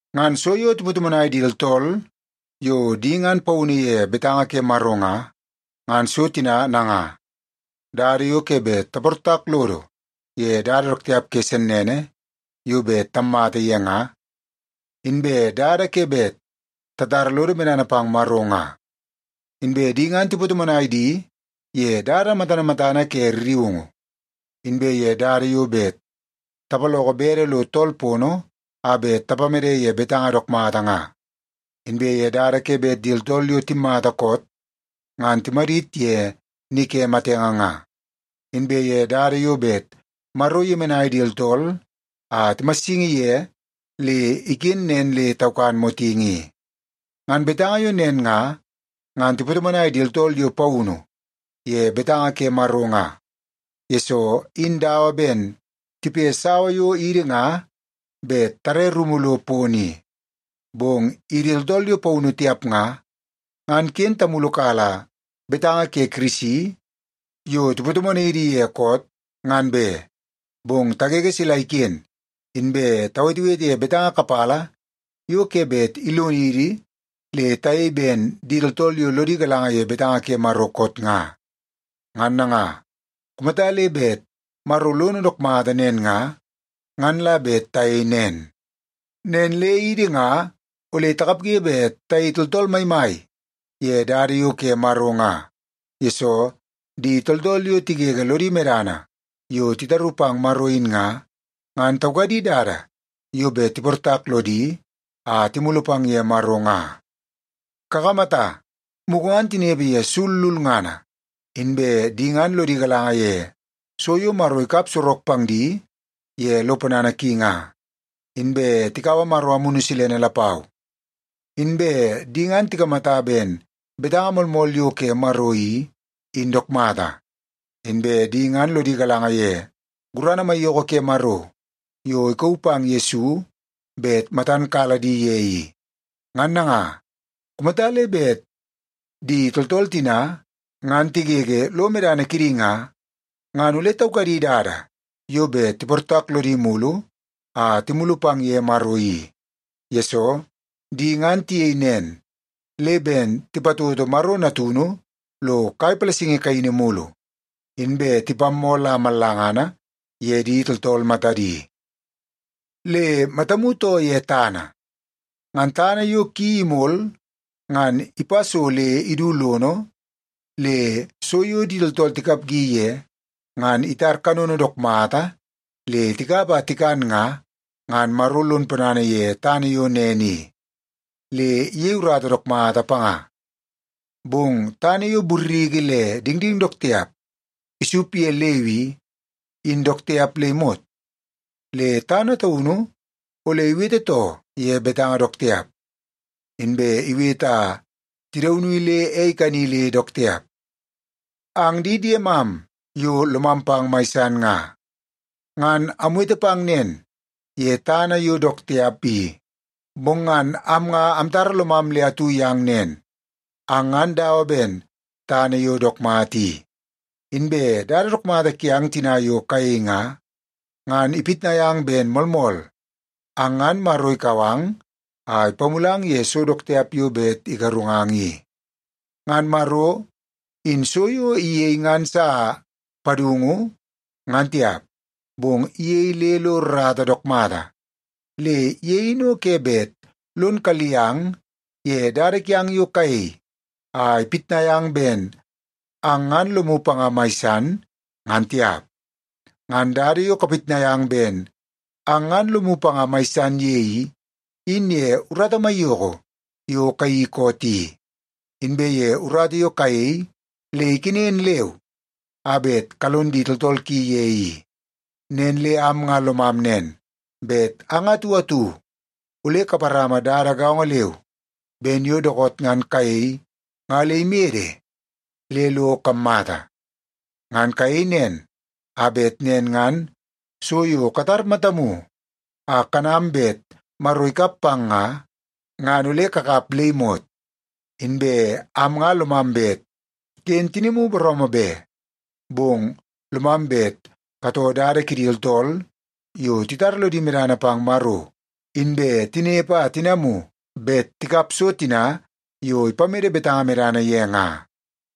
Ngan so yo tipatomonai di tooltool yo di ngan paunu ye betanga ke Maro nga, ngan so tina nanga: dada yo ke bet taportak lodo ye dada dook tiap ke sennene yo bet tammata ye nga, inbe dada ke bet tatara lodo medana pang Maro nga. Inbe di ngan tipatomonai di ye dada matana matana ke rriungu, inbe ye dada yo bet tapaloko bede lo tool pono a bet tapamede ye betanga dook mata nga, inbe ye dada ke bet di tooltool yo timmata koot ngan timadit ye ni ke matenge nga, inbe ye dada yo bet Maro iyemenai di tooltool a timassingi ye le iken nen le taukan motingi i. Ngan betanga yo nen nga, ngan tipatomonai di tooltool yo paunu ye betanga ke Maro nga, yesoo in dawa ben tipe sawa yo idi nga bet tare rumu lo pono i. Bong idi tooltool yo paunu tiap nga, ngan ken tamulukala betanga ke Kirisi yo tipatomonai idi ye koot, ngan be. Bong tagege sila iken inbe tawetewete ye betanga kapala yo ke bet ilonidi le tayei ben di tooltool yo lodi galanga ye betanga ke Maro koot nga. Ngan nanga, kumata le bet Maro lono dook mata nen nga, ngan la bet tayei nen. Nen le idi nga ole takapge bet tayei tooltool maimai ye dada yo ke Maro nga, yesoo di tooltool yo tigege lodi medana yo titaru pang Maro in nga, ngan taukadi dada yo bet tiportak lodi a timulu pang ye Maro nga. Kakamata, mugu ngan tinepe ye sul lulngana, inbe di ngan lodi galanga ye so yo Maro ikap sorok pang di ye lo ponana ki nga, inbe tikaua Maro Amunu Silene lapau. Inbe di ngan tikamata ben betanga moolmool yo ke Maro i, in dook mata. Inbe di ngan lodi galanga ye gurana maiyoko ke Maro yo ikauu pang Yesu bet matan kala di ye i. Ngan nanga, kumata le bet di tooltool tina ngan tigege lo medana kidi nga, ngan ole taukadi dada yo bet tiportak lodi mulu a timulu pang ye Maro i. Yesoo, di ngan tiyei nen le ben tipatoto Maro Natunu lo kai palasingi kaini mulu, inbe tipammoo la mallanga ye di tooltool matadi. Le matamu too ye tana. Ngan tana yo ki imol ngan ipa so le idu lono, le so yo di tooltool tikapgi ye ngan itar kanono dook mata le tikap a tikan nga, ngan Maro lon ponana ye tana yo nen i, le iyei urata dook mata panga. Bong tana yo burriki le dingding dook tiap isup ye leu i, in dook tiap le imot. Le tana taunu ole iwete too ye betanga dook tiap, inbe iwete a tidauni le ei ikani le dook tiap. Ang di diemam yo lomam pang mai san nga, ngan amwete pang nen ye tana yo dook tiap i, bong ngan am nga amtara lomam le atu yang nen, ang ngan dawa ben tana yo dook mata i. Inbe dada dook mata kiang tina yo kayei nga, ngan ipitnai ang ben moolmool, ang ngan Maro ikau ang a ipamulang ye so dook tiap yo bet igarungang i. Ngan Maro in so yo iyei ngan sa padungu ngan tiap, bong iyei le lo rrata dook mata. Le ye in o ke bet lon kalli ang ye dada kiang yo kayei a ipitnai ang ben ang ngan lomu panga mai san, ngan tiap. Ngan dada yo kapitnai ang bet ang ngan lomu panga mai san ye i, in ye urata maiyoko yo kayeii koot i, inbe ye urata yo kayei le ikenen leu a bet kalon di tooltool ki ye i. Nen le am nga lomam nen, bet ang atu atu ole kaparama dada gaongo leu ben yo dookoot ngan kayei nga le imede le lo kammata. Ngan kayei nen, a bet nen ngan so yo katar matamu a kanam bet Maro ikap pang nga, ngan ole kakap le imot. Inbe am nga lomam bet ken tinimu booroomoo be. Bong lomam bet katoo dada kidi tooltool yo titara lodi medana pang Maro, inbe tinepe a tinamu bet tikap so tina yo ipamede betanga medana ye nga.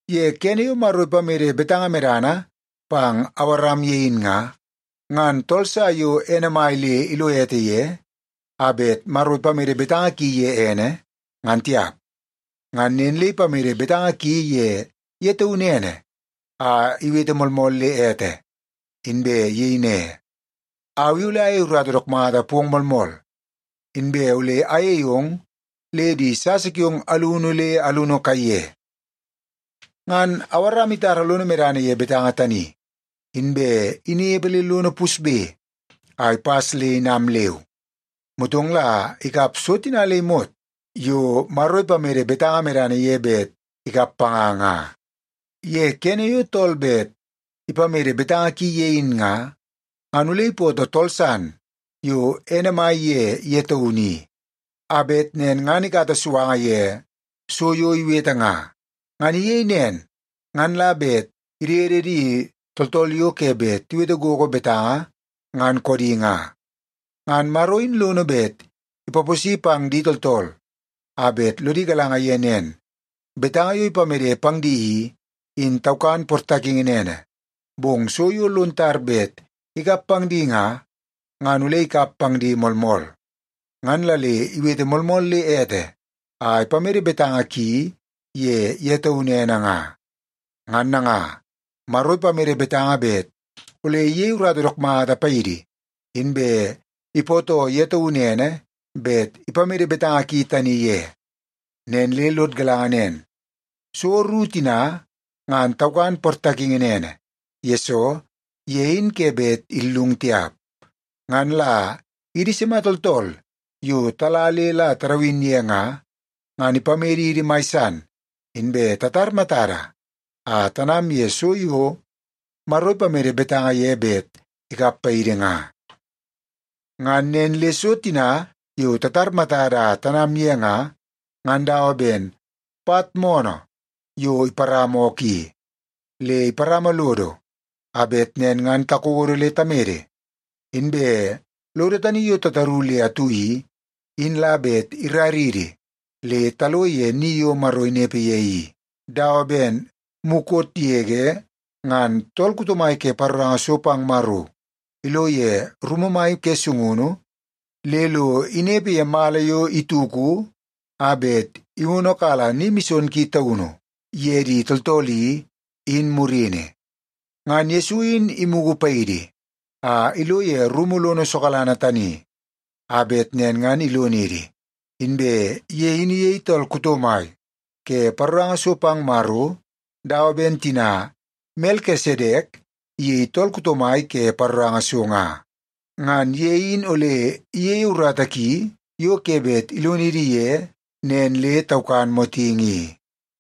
Ye kene yo Maro ipamede betanga medana pang Awaram ye in nga, ngan tool sa yo ene mai le ilo ete ye a bet Maro ipamede betanga ki ye ene, ngan tiap. Ngan nen le ipamede betanga ki ye ye taunu ene a iwete moolmool le ete, inbe iyei ne, “Au i ole ayei urata dook mata pong moolmool, inbe ole ayei ong le di sasa kiong alunu le alunu kaiye.” Ngan Awaram itara lono medana ye betanga tani, inbe inepe le lono pusbe a ipas le inam leu. Motong la ikap so tina le imot yo Maro ipamede betanga medana ye bet ikap panga nga. Ye kene yo tool bet ipamede betanga ki ye in nga, ngan ole ipootoo tool san yo ene mai ye ye taunu i, a bet nen ngan ikata suanga ye so yo iwete nga. Ngan iyei nen ngan la bet idede di tooltool yo ke bet tiwete gogo betanga, ngan koodi nga. Ngan Maro in lono bet ipaposi pang di tooltool a bet lodi galanga ye nen, betanga yo ipamede pang di i, in taukan portakingi nene, bong so yo lon tar bet ikap pang di nga, ngan ole ikap pang di moolmool. Ngan la le iwete moolmool le ete a ipamede betanga ki ye ye taunu ene nga. Ngan nanga, Maro ipamede betanga bet ole iyei urata dook mata paidi, inbe ipootoo ye taunu ene bet ipamede betanga ki tani ye. Nen le lod galanga nen, so ru tina, ngan taukan portakingi nene, yesoo ye in ke bet illung tiap. Ngan la idi sima tooltool yo tala le la tadawin ye nga, ngan ipamedidi mai san inbe tatar matada a tanam ye so yo Maro ipamede betanga ye bet ikap paidi nga. Ngan nen le so tina yo tatar matada a tanam ye nga, ngan dawa ben pat moonoo yo iparama ookoo i. Le iparama lodo a bet nen ngan takodo le tamede. Inbe lodo tani yo tataru le atu i, in la bet iraridi le talo ye ni yo Maro inepe ye i, dawa ben mukot yege ngan tool kuto mai ke paroranga so pang Maro ilo ye rumu mai ke sungunu le lo inepe ye mala yo ituku a bet iwonokala Ni Mison Ki Taunu ye di tooltool i, in murini. Ngan Yesu in imugu paidi a ilo ye rumu lono sokalanga tani, a bet nen ngan ilonidi. Inbe ye in iyei tool kuto mai ke paroranga so pang Maro dawa ben tina Melkisedek iyei tool kuto mai ke paroranga so nga. Ngan ye in ole iyeie urata ki yo ke bet ilonidi ye nen le taukan motingi i.